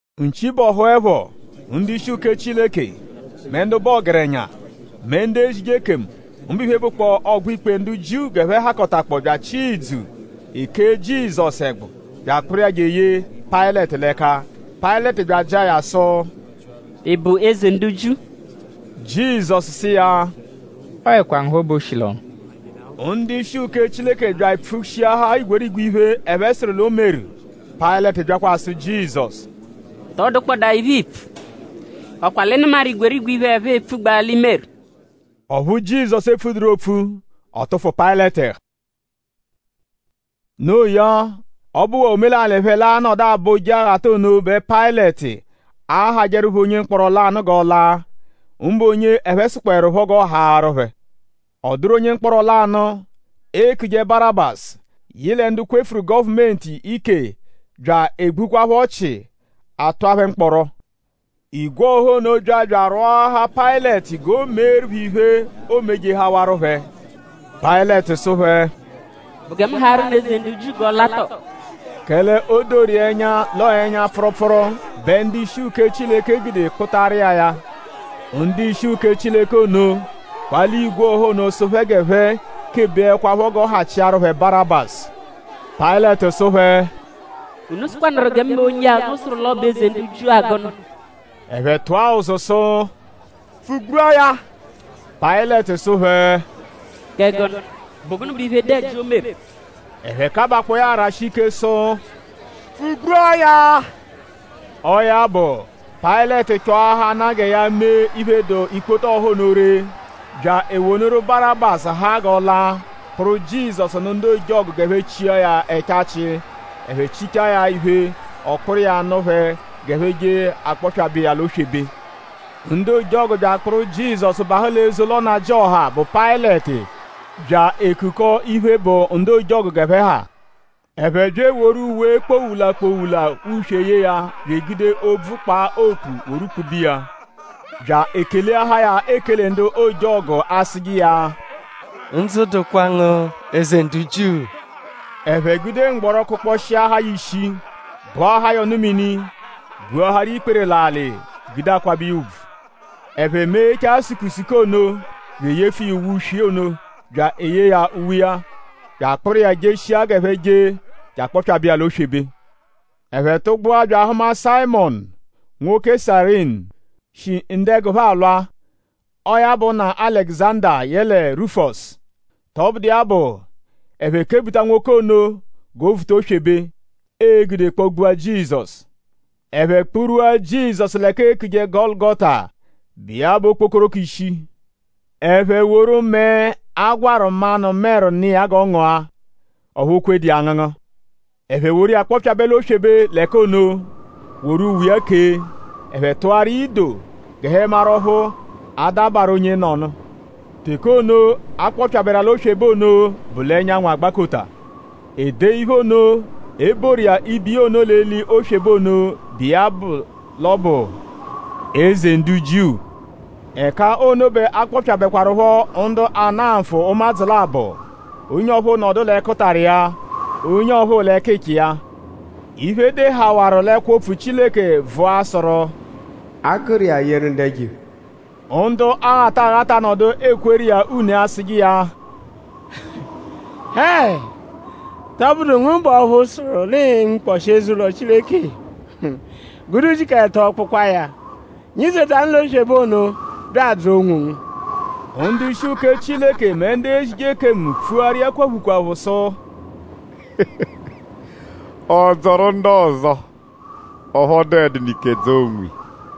Nchi bọhuepho; ndu-ishi uke Chileke; mẹ ndu bụ ọgerenya; mẹ ndu ezije ekemu; mbụ iphe, bụkpoo ọgbo-ikpe ndu Jiu g'ẹphe hakọta bya achịa idzu; e kee Jizọsu ẹgbu bya akpụru iya je eye Payịleti l'ẹka. Payịleti bya ajịa ya sụ: “?Ị bụ Eze ndu Jiu?” Jizọsu sụ iya: “Ọoekwa ngu phọ bẹ o shi l'ọnu.” Ndu-ishi uke Chileke bya epfushiahaa igwerigwe iphe, ẹphe sụru l'o meru. Payịleti byakwa asụ Jizọsu: “?Tọ dụkpodaa iphe, iipfu??Ọ kwa l'ị nụmaru igwerigwe iphe, ẹphe epfugbaa l'i meru?” Ọphu Jizọsu epfuẹduru opfu. Ọ tụfu Payịleti ẹhu. Noo ya; ọ bụwaa omelalị phẹ l'anọdu abọ Ọbo Ojeghata ono bẹ Payịleti ahajẹru phẹ onye mkpọro lanụ g'ọ la; mbụ onye ẹphe sụkpoerupho g'ọ haarụ phẹ. Ọ dụru onye mkpọro lanụ, eekuje Barabasu, yị lẹ ndu kwefuru gọvumenti ike bya egbukwaaphọ ọchi; a tụa phẹ mkpọro. Igwe ọha ono bya bya arwọahaa Payịleti g'o meeru phẹ iphe, oomejehawaru phẹ. Payịleti sụ phẹ: “?Bụ gẹ mu haarụ unu Eze ndu Jiu g'ọ la tọo?” Kẹle o doru iya ẹnya l'ọo ẹnya-pfụrupfuru bẹ ndu-ishi uke Chileke gude kpụtaru iya ya. Ndu-ishi uke Chileke ono kpalia igwe ọha ono sụ phẹ g'ẹphe kebeẹkwapho g'ọ hachiaru phẹ Barabasu. Payịleti sụ phẹ: “?Unu sụkwanuru gẹ mu mee onye-a, unu sụru l'ọ bụ Eze ndu Jiu-a gụnu?” Ẹphe tụa ụzu; sụ: “Pfụ-gbua ya!” Payịleti sụ phẹ: “?Kẹ gụnu??Bụ gụnu bụ iphe, dụ ẹji, o meru?” Ẹphe kabakpọo ya arashi ike sụ: “Pfụ-gbua ya!” Ọo ya bụ; Payịleti chọahanaa gẹ ya mee iphe, dụ ikpoto ọha ono ree; bya ewonụru Barabasu haa g'ọ la; kpụru Jizọsu nụ ndu ojọgu g'ẹphe chia ya ẹchachi. Ẹphe chichaa ya iphe; ọ kpụru iya nụ phẹ g'ẹphe je je akpọpyabe iya l'oswebe. Ndu ojọgu bya akpụru Jizọsu bahụ l'eze ụlo nnajịoha, bụ Payịleti bya ekukọta iphe, bụ ndu ojọgu g'ẹphe ha. Ẹphe bya eworu uwe kpowula-kpowula uswe yee ya bya egude obvu kpaa okpu woru kpube iya; bya ekeleahaa ya ekele ndu ojọgu asụje iya: “Ndzụ dụkwa ngu! Eze ndu Jiu!” Ẹphe gude mgbọro kụkposhiahaa ya ishi; gbụahaa ya ọnu-mini; gbuaharu iya ikpere l'alị gude akwabẹ iya ùbvù. Ẹphe meghechaa ya sukusuku ono bya eyefu iya uwe uswe ono; bya eyee ya uwe iya; bya akpụru iya jeshia g'ẹphe je je akpọpyabe iya l'oswebe. Ẹphe tụgbua bya ahụma Sayịmonu nwoke Sayirini, shi ndu-ẹgu phẹ alwa. Ọo ya bụ nna Alẹguzanda yẹle Rufọsu. Tọbudu iya bụ; ẹphe kebuta nwoke ono g'o vuta oswebe, ee-gude kpọ-gbua Jizọsu. Ẹphe kpurwua Jizọsu l'ẹka eekuje Gọlugota, bụ iya bụ “Okpokoroko Ishi.” Ẹphe woru mẹe, a gwarụ manụ-mẹru nụ iya g'ọ ngụa. Ọphu o kwedu iya angụngu. Ẹphe woru iya kpọpyabe l'oswebe l'ẹka ono; woru uwe iya kee. Ẹphe tụaru iya ido g'ẹphe maru ọphu a-dabarụ onyenọnu. Teke ono, a kpọpyaberu iya l'oswebe ono bụ l'ẹnyanwu agbakota. E dee iphe ono, e boru iya ibo iya ono l'eli oswebe ono, bụ iya bụ l'ọ bụ “Eze ndu Jiu.” Ẹka ono bẹ a kpọpyabekwarupho ndu ana nfụ ụmadzu labọ. Onye ọphuu nọdu l'ẹkutara iya; onye ọphuu l'ẹkicha iya. Iphe, e dehawaru l'ẹkwo-opfu Chileke vụa sụru: “A gụru iya yeru ndu ẹjo-iphe.” Ndu aghata aghata nọdu ekweru iya une asụje iya: “Hẹe!?Tọbudu ngu bụ ọphu sụru l'ii-nwukpọshi eze-ụlo Chileke; gude ujiku ẹto kpụkwaa ya? Nyizetanụ l'oswebe ono bya adzọo onwongu.” Ndu-ishi uke Chileke mẹ ndu ezije ekemu pfuaru iya kwaphu kwaphu sụ: “Ọ dzọru ndu ọzo; ọphu ọ dụedunu ike dzọo onwiya.”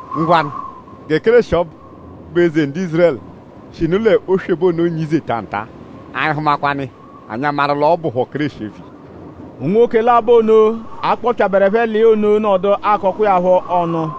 “Ngwanụ gẹ Kéreshi ọbu, bụ Eze ndu Ízurẹlu shinu l'oswebe ono nyizeta nta-a; anyi -hụmakwanu iya; anyi amaru l'ọ bụpho Kéreshi eviya.” Unwoke labọ ono, a kpọpyaberu ẹphe l'iya ono nọdu akọkwa iya phọ ọnu.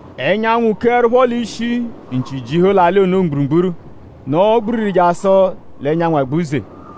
Ẹnyanwu keẹrupho l'ishi; nchi jihu l'alị ono mgburugburu; nọo gbiriri jasụ l'ẹnyanwu agbuze.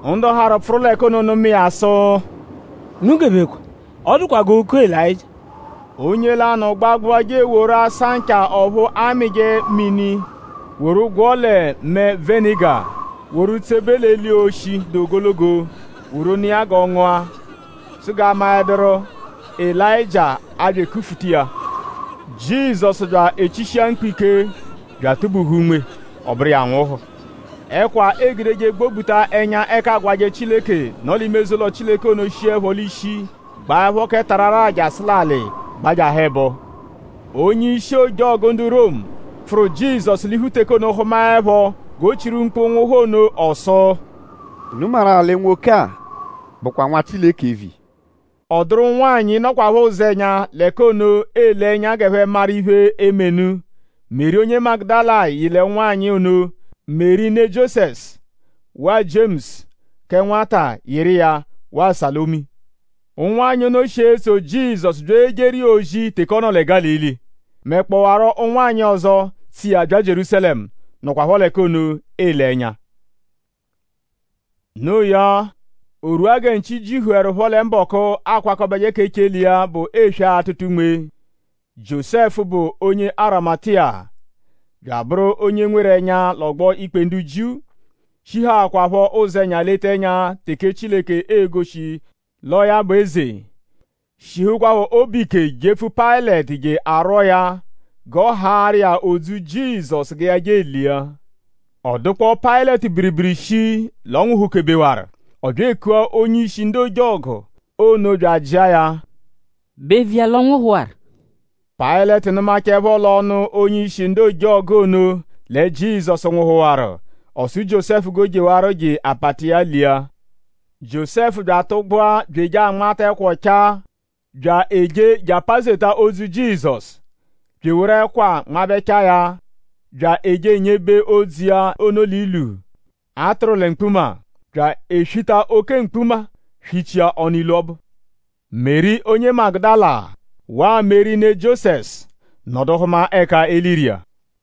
Ndu harụ pfụru l'ẹka ono nụma iya sụ: “Unu gebekwa; ọ dụkwa g'ooku Elayịjia.” Onye lanụ gbagbụa je eworu asancha ọphu amịje mini woru gwọo lẹ mẹe-venịga; woru tsebe l'eli oshi, dụ ogologo woru nụ iya g'ọ ngụa; sụ g'a maẹduru:?Elayịjia a-bya ekufuta iya. Jizọsu bya echishia mkpu ike bya atụ-buhu unme; ọ bụru iya anwụhu. Ẹkwa, eegudeje gbobuta ẹnya ẹka aagwajẹ Chileke, nọ l'ime eze-ụlo Chileke ono shiẹpho l'ishi gbaẹpho kẹ tararaa jasụ l'alị gbajahụ ẹbo. Onye-ishi ojọgu ndu Romu, pfụru Jizọsu l'iphu teke ono hụmaepho g'o chiru mkpu nwụhu nno ọ sụ: “?Unu maru-a lẹ nwoke-a bụkwa Nwa Chileke eviya?” Ọ dụru ụnwanyi, nọkwapho ụzenya l'ẹka ono ele ẹnya g'ẹphe maru iphe, eme nụ. Meri onye Magudala yị l'ụnwanyi ono. Meri ne Jiosẹsu; waa Jiemusu kẹ nwata yịru iya; waa Salomi. Ụnwanyi ono shi etso Jizọsu bya ejeru iya ozi teke ọ nọ lẹ Gálili; mẹkpowaro ụnwanyi ọzo, tso iya bya Jierúsalẹmu, nọkwapho l'ẹka ono ele ẹnya. Noo ya; o rwua gẹ nchi jihuẹrupho lẹ mbọku, akwakọbeje k'echele iya bụ eswe atụta unme; Jiósẹfu, bụ onye Arimatiya bya abụru onye nweru ẹnya l'ọgbo-ikpe ndu Jiu, shihaakwaphọ ụzenya leta ẹnya teke Chileke e-goshi l'ọo ya bụ eze; shihukwaphọ obu ike jepfu Payịleti je arwọo ya g'a haarụ iya odzu Jizọsu gẹ ya je elia. Ọ dụkpoo Payịleti biribiri shii l'ọ nwụhu-kebewaru. Ọ bya ekua onye-ishi ndu ojọgu ono bya ajịa ya: “?Bụ eviya l'ọ nwụhuwaru?” Payịleti nụmachaepho l'ọnu onye-ishi ndu ojọgu ono lẹ Jizọsu nwụhuwaru; ọ sụ Jiósẹfu g'o jewarọ je apata iya lia. Jiósẹfu bya atụgbua bya eje anmata ẹkwa ọchaa; bya eje je apazeta odzu Jizọsu; bya eworu ẹkwa nmabẹchaa ya; bya eje enyebe odzu iya ono l'ilu, a tụru lẹ mkpuma; bya eswita oke mkpuma swichia ọnu ilu ọbu. Meri onye Magudala waa Meri ne Jiosẹsu nọdu hụma ẹka e liru iya.